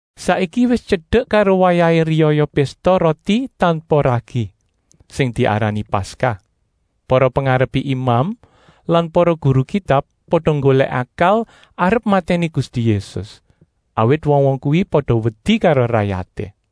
Saiki wis tyedek karo wayahé riyaya Pésta Roti Tanpa Ragi, sing diarani Paskah. Para pengarepé imam lan para guru Kitab pada nggolèk akal arep matèni Gusti Yésus, awit wong-wong kuwi pada wedi karo rayaté.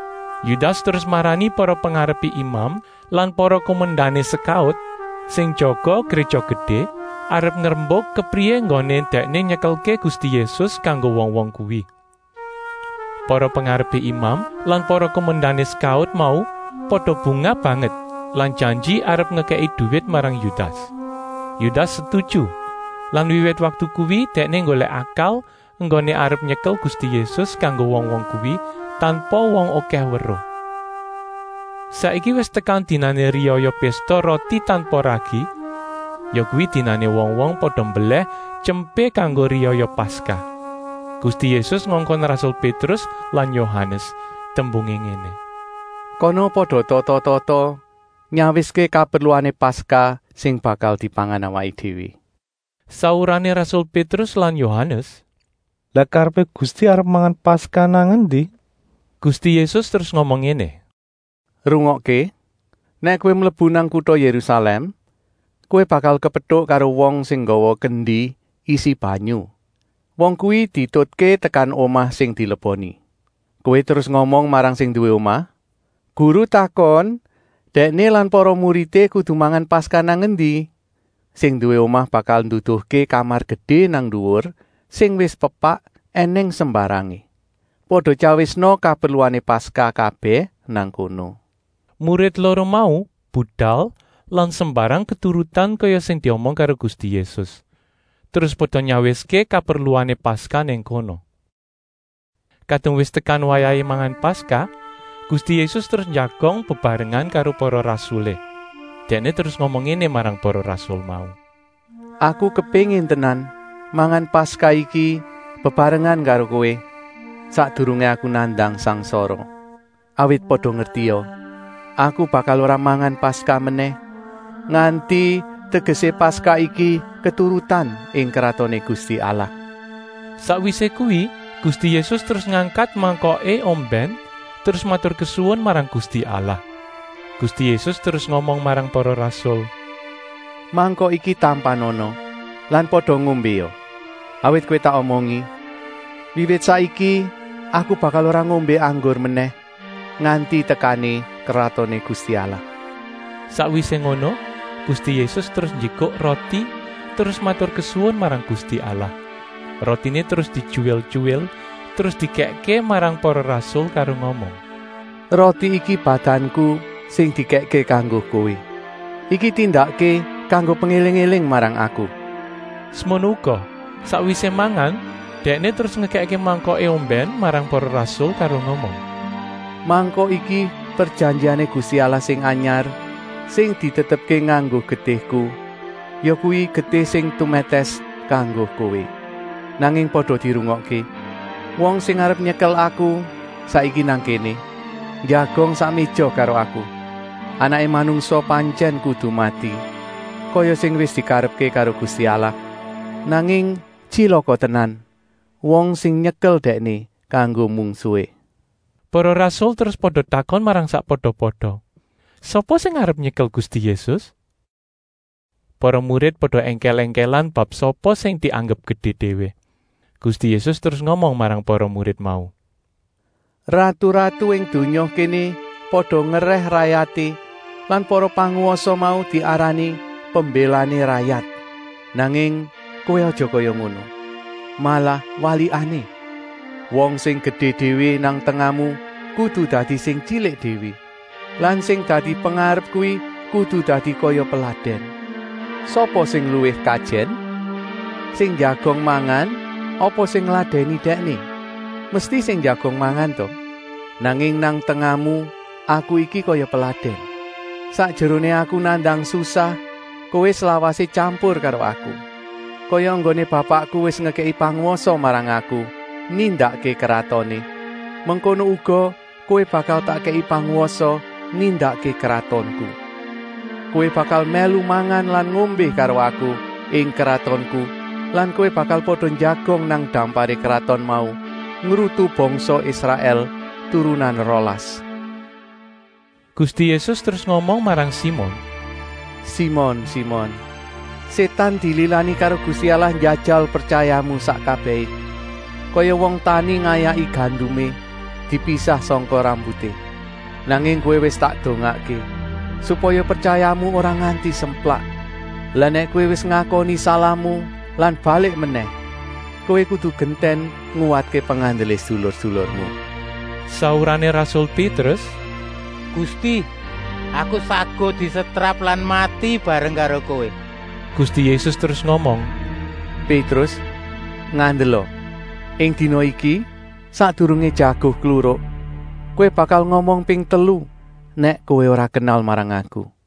Yudas terus marani para pengarepé imam lan para kumendané sekaut sing jaga Gréja Gedé, arep ngrembuk kepriyé enggoné dèkné nyekelké Gusti Yésus kanggo wong-wong kuwi. Para pengarepé imam lan para kumendané sekaut mau pada bungah banget lan janji arep ngekèki duwit marang Yudas. Yudas setuju lan wiwit waktu kuwi dèkné nggolèk akal enggoné arep nyekel Gusti Yésus kanggo wong-wong kuwi, tanpa wong okèh weruh. Saiki wis tekan dinané riyaya Pésta Roti Tanpa Ragi, yakuwi dinané wong-wong pada mbelèh tyempé kanggo riyaya Paskah. Gusti Yésus ngongkon rasul Pétrus lan Yohanes, tembungé ngéné: “Kana pada tata-tata nyawiské kaperluané Paskah sing bakal dipangan awaké déwé.” Saurané rasul Pétrus lan Yohanes: “Lah karepé Gusti arep mangan Paskah nang endi?” Gusti Yésus terus ngomong ngéné: “Rungokké! Nèk kowé mlebu nang kuta Yérusalèm, kowé bakal kepetuk karo wong sing nggawa kendi isi banyu. Wong kuwi dietutké tekan omah sing dileboni. Kowé terus ngomong marang sing nduwé omah: ‘Guru takon, Dèkné lan para muridé kudu mangan Paskah nang endi?’ Sing nduwé omah bakal nduduhké kamar gedé nang nduwur sing wis pepak ènèng sembarangé. Pada tyawisna kaperluané Paskah kabèh nang kono.” Murid loro mau budal lan sembarang keturutan kaya sing diomong karo Gusti Yésus, terus pada nyawiské kaperluané Paskah nang kono. Kadung wis tekan wayahé mangan Paskah, Gusti Yésus terus njagong bebarengan karo para rasulé. Dèkné terus ngomong ngéné marang para rasul mau: “Aku kepéngin tenan mangan Paskah iki bebarengan karo kowé, sakdurungé Aku nandang sangsara. Awit pada ngertia! Aku bakal ora mangan Paskah menèh, nganti tegesé Paskah iki keturutan ing Kratoné Gusti Allah.” Sakwisé kuwi Gusti Yésus terus ngangkat mangkoké ombèn terus maturkesuwun marang Gusti Allah. Gusti Yésus terus ngomong marang para rasul: “Mangkok iki tampanana lan pada ngombéa. Awit kowé tak omongi, wiwit saiki iki Aku bakal ora ngombé anggur menèh, nganti tekané Kratoné Gusti Allah.” Sakwisé ngono Gusti Yésus terus njikuk roti terus maturkesuwun marang Gusti Allah. Rotiné terus dityuwil-tyuwil terus dikèkké marang para rasul karo ngomong: “Roti iki badanku sing dikèkké kanggo kowé. Iki tindakké kanggo pengéling-éling marang Aku.” Semono uga, sakwisé mangan, Dèkné terus ngekèkké mangkoké ombèn marang para rasul karo ngomong: “Mangkok iki prejanjiané Gusti Allah sing anyar, sing ditetepké nganggo getihku, yakuwi getih sing tumètès kanggo kowé. “Nanging pada dirungokké! Wong sing arep nyekel Aku saiki nang kéné, njagong sak méja karo Aku! Anaké Manungsa pantyèn kudu mati, kaya sing wis dikarepké karo Gusti Allah, nanging tyilaka tenan wong sing nyekel Dèkné kanggo mungsuhé.” Para rasul terus pada takon marang sakpada-pada, sapa sing arep nyekel Gusti Yésus. Para murid pada èngkèl-èngkèlan bab sapa sing dianggep gedé déwé. Gusti Yésus terus ngomong marang para murid mau: “Ratu-ratu ing donya kéné pada ngerèh rayaté lan para pangwasa mau diarani ‘Pembélané rayat.’ Nanging kowé aja kaya ngono. Malah walikané: wong sing gedé déwé nang tengahmu kudu dadi sing tyilik déwé lan sing dadi pengarep kuwi kudu dadi kaya peladèn. Sapa sing luwih kajèn: sing njagong mangan apa sing ngladèni dèkné? Mesti sing njagong mangan ta? Nanging nang tengahmu Aku iki kaya peladèn. “Sakjeroné Aku nandang susah kowé slawasé tyampur karo Aku. Kaya enggoné Bapakku wis ngekèki pangwasa marang Aku nindakké kratoné, mengkono uga kowé bakal tak kèki pangwasa nindakké kratonku. Kowé bakal mèlu mangan lan ngombé karo Aku ing kratonku lan kowé bakal pada njagong nang damparé kraton mau, ngrutu bangsa Israèl turunan rolas.” Gusti Yésus terus ngomong marang Simon: “Simon, Simon! Sétan dililani karo Gusti Allah njajal pretyayamu sak kabèhé, kaya wong tani ngayaki gandumé, dipisah sangka rambuté. Nanging kowé wis tak dongaké, supaya pretyayamu ora nganti semplak. Lah nèk kowé wis ngakoni salahmu lan balik menèh, kowé kudu gentèn nguwatké pengandelé sedulur-sedulurmu.” Saurané rasul Pétrus: “Gusti, aku saguh disetrap lan mati bareng karo Kowé!” Gusti Yésus terus ngomong: “Pétrus, ngandela! Ing dina iki, sakdurungé jago kluruk, kowé bakal ngomong ping telu, nèk kowé ora kenal marang Aku.”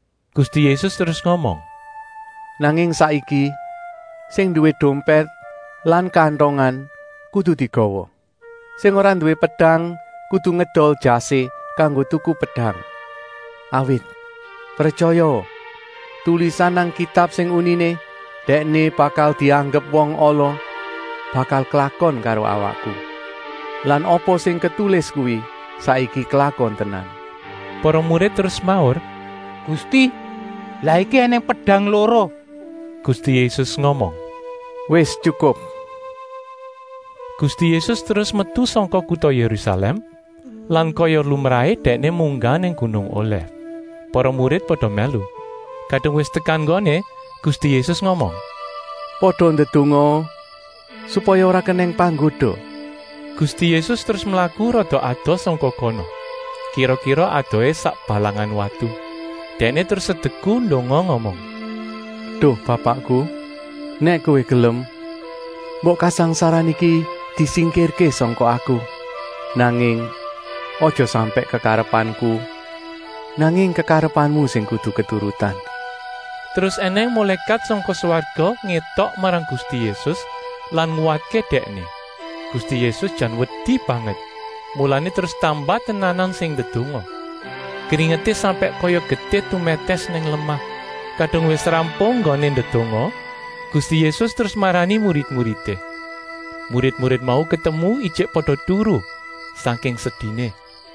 Gusti Yésus terus ngomong: “Nanging saiki, sing nduwé dompèt lan kantongan kudu digawa; sing ora nduwé pedang kudu ngedol jasé kanggo tuku pedang. Awit, pretyayaa! Tulisan nang Kitab sing uniné: ‘Dèkné bakal dianggep wong ala,’ bakal klakon karo awakku. Lan apa sing ketulis kuwi saiki klakon tenan.” Para murid terus semaur: “Gusti, lah iki ènèng pedang loro.” Gusti Yésus ngomong: “Wis tyukup!” Gusti Yésus terus metu sangka kuta Yérusalèm lan kaya lumrahé Dèkné munggah nang gunung Olèf. Para murid pada mèlu. Kadung wis tekan nggoné, Gusti Yésus ngomong: “Pada ndedongaa supaya ora kenèng panggoda.” Gusti Yésus terus mlaku rada adoh sangka kono, kira-kira adohé sak balangan watu. Dèkné terus sedeku ndonga ngomong: “Duh Bapakku, nèk Kowé gelem, mbok kasangsaran iki disingkirké sangka Aku! Nanging, aja sampèk kekarepanku, nanging kekarepanmu sing kudu keturutan.” ( Terus ènèng mulékat sangka swarga ngétok marang Gusti Yésus lan nguwatké Dèkné. Gusti Yésus jan wedi banget, mulané terus tambah tenanan sing ndedonga. Kringeté sampèk kaya getih tumètès nang lemah.) Kadung wis rampung enggoné ndedonga, Gusti Yésus terus marani murid-muridé. Murid-murid mau ketemu ijik pada turu, sangking sediné.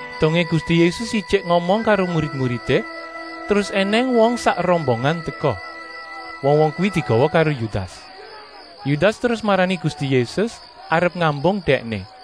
Dongé Gusti Yésus ijik ngomong karo murid-muridé, terus ènèng wong sak rombongan teka. Wong-wong kuwi digawa karo Yudas. Yudas terus marani Gusti Yésus arep ngambung Dèkné.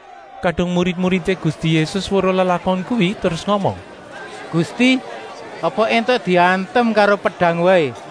Kadung murid-muridé Gusti Yésus weruh lelakon kuwi terus ngomong: “Gusti, apa éntuk diantem karo pedang waé?”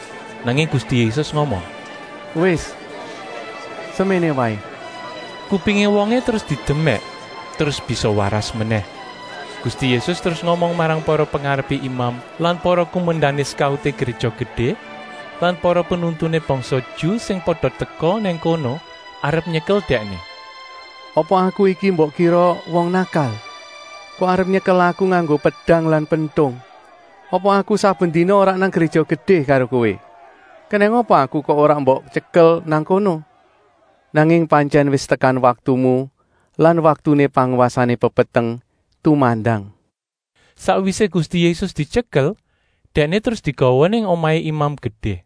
Nanging Gusti Yésus ngomong: “Wis, seméné waé!” Kupingé wongé terus didemèk, terus bisa waras menèh. Gusti Yésus terus ngomong marang para pengarepé imam lan para kumendané sekauté Gréja Gedé lan para penuntuné bangsa Ju sing pada teka nang kono arep nyekel Dèkné: “Apa Aku iki mbok kira wong nakal, kok arep nyekel Aku nganggo pedang lan pentung? Apa Aku saben dina ora nang Gréja Gedé karo kowé. Kenèng apa Aku kok ora mbok tyekel nang kono? Nanging pantyèn wis tekan waktumu lan waktuné pangwasané pepeteng tumandang.” Sakwisé Gusti Yésus dityekel, Dèkné terus digawa nang omahé Imam Gedé.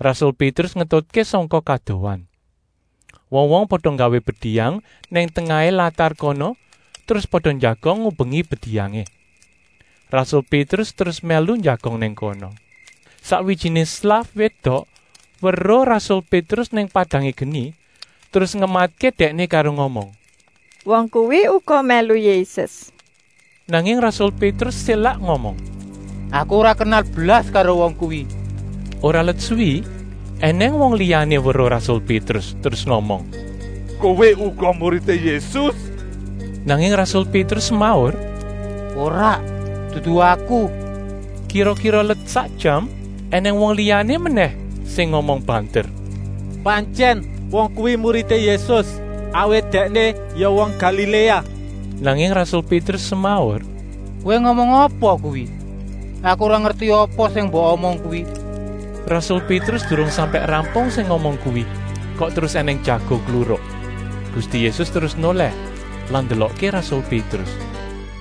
Rasul Pétrus ngetutké sangka kadohan. Wong-wong pada nggawé bediyang nang tengahé latar kono terus pada njagong ngubengi bediyangé. Rasul Pétrus terus mèlu njagong nang kono. Sakwijiné slaf wédok weruh rasul Pétrus nang padangé geni, terus ngematké dèkné karo ngomong: “Wong kuwi uga mèlu Yésus!” Nanging rasul Pétrus sélak ngomong: “Aku ora kenal blas karo wong kuwi!” Ora let suwi ènèng wong liyané weruh rasul Pétrus terus ngomong: “Kowé uga muridé Yésus!” Nanging rasul Pétrus semaur: “Ora, dudu aku!” Kira-kira let sak jam ènèng wong liyané menèh sing ngomong banter: “Pantyèn wong kuwi muridé Yésus, awit dèkné ya wong Galiléa!” Nanging rasul Pétrus semaur: “Kowé ngomong apa kuwi? Aku ora ngerti apa sing mbok omong kuwi!” Rasul Pétrus durung sampèk rampung sing ngomong kuwi, kok terus ènèng jago kluruk. Gusti Yésus terus nolèh lan ndelokké rasul Pétrus.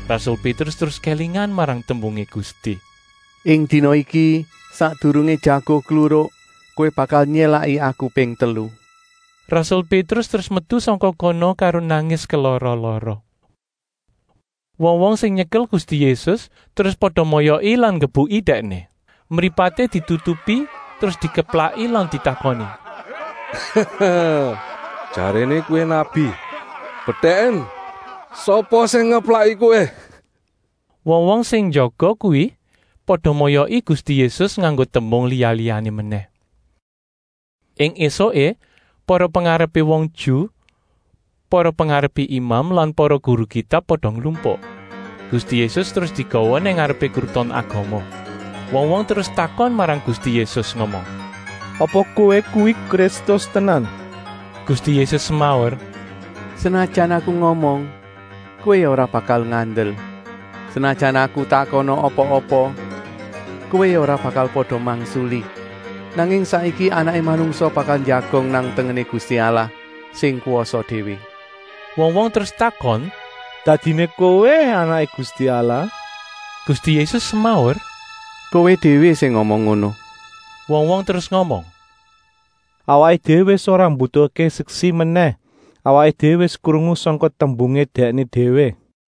Rasul Pétrus terus kélingan marang tembungé Gusti: “Ing dina iki, sakdurungé jago kluruk, kowé bakal nyélaki Aku ping telu.” Rasul Pétrus terus metu sangka kono karo nangis kelara-lara. Wong-wong sing nyekel Gusti Yésus terus pada moyoki lan nggebuki Dèkné. Mripaté ditutupi terus dikeplaki lan ditakoni: “Jaréné kowé nabi, bedèken sapa sing ngeplaki Kowé?” Wong-wong sing njaga kuwi pada moyoki Gusti Yésus nganggo tembung liya-liyané menèh. Ing ésuké para pengarepé wong Ju, para pengarepé imam lan para guru Kitab pada nglumpuk. Gusti Yésus terus digawa nang ngarepé Kruton Agama. Wong-wong terus takon marang Gusti Yésus ngomong: “Apa kowé kuwi Kristus tenan!” Gusti Yésus semaur: “Senajan Aku ngomong, kowé ya ora bakal ngandel. Senajan Aku takona apa-apa, kowé ya ora bakal pada mangsuli. Nanging saiki Anaké Manungsa bakal njagong nang tengené Gusti Allah sing kwasa déwé.” Wong-wong terus takon: “Dadiné Kowé Anaké Gusti Allah?” Gusti Yésus semaur: “Kowé déwé sing ngomong ngono!” Wong-wong terus ngomong: “Awaké déwé wis ora mbutuhké seksi menèh. Awaké déwé wis krungu sangka tembungé Dèkné déwé.”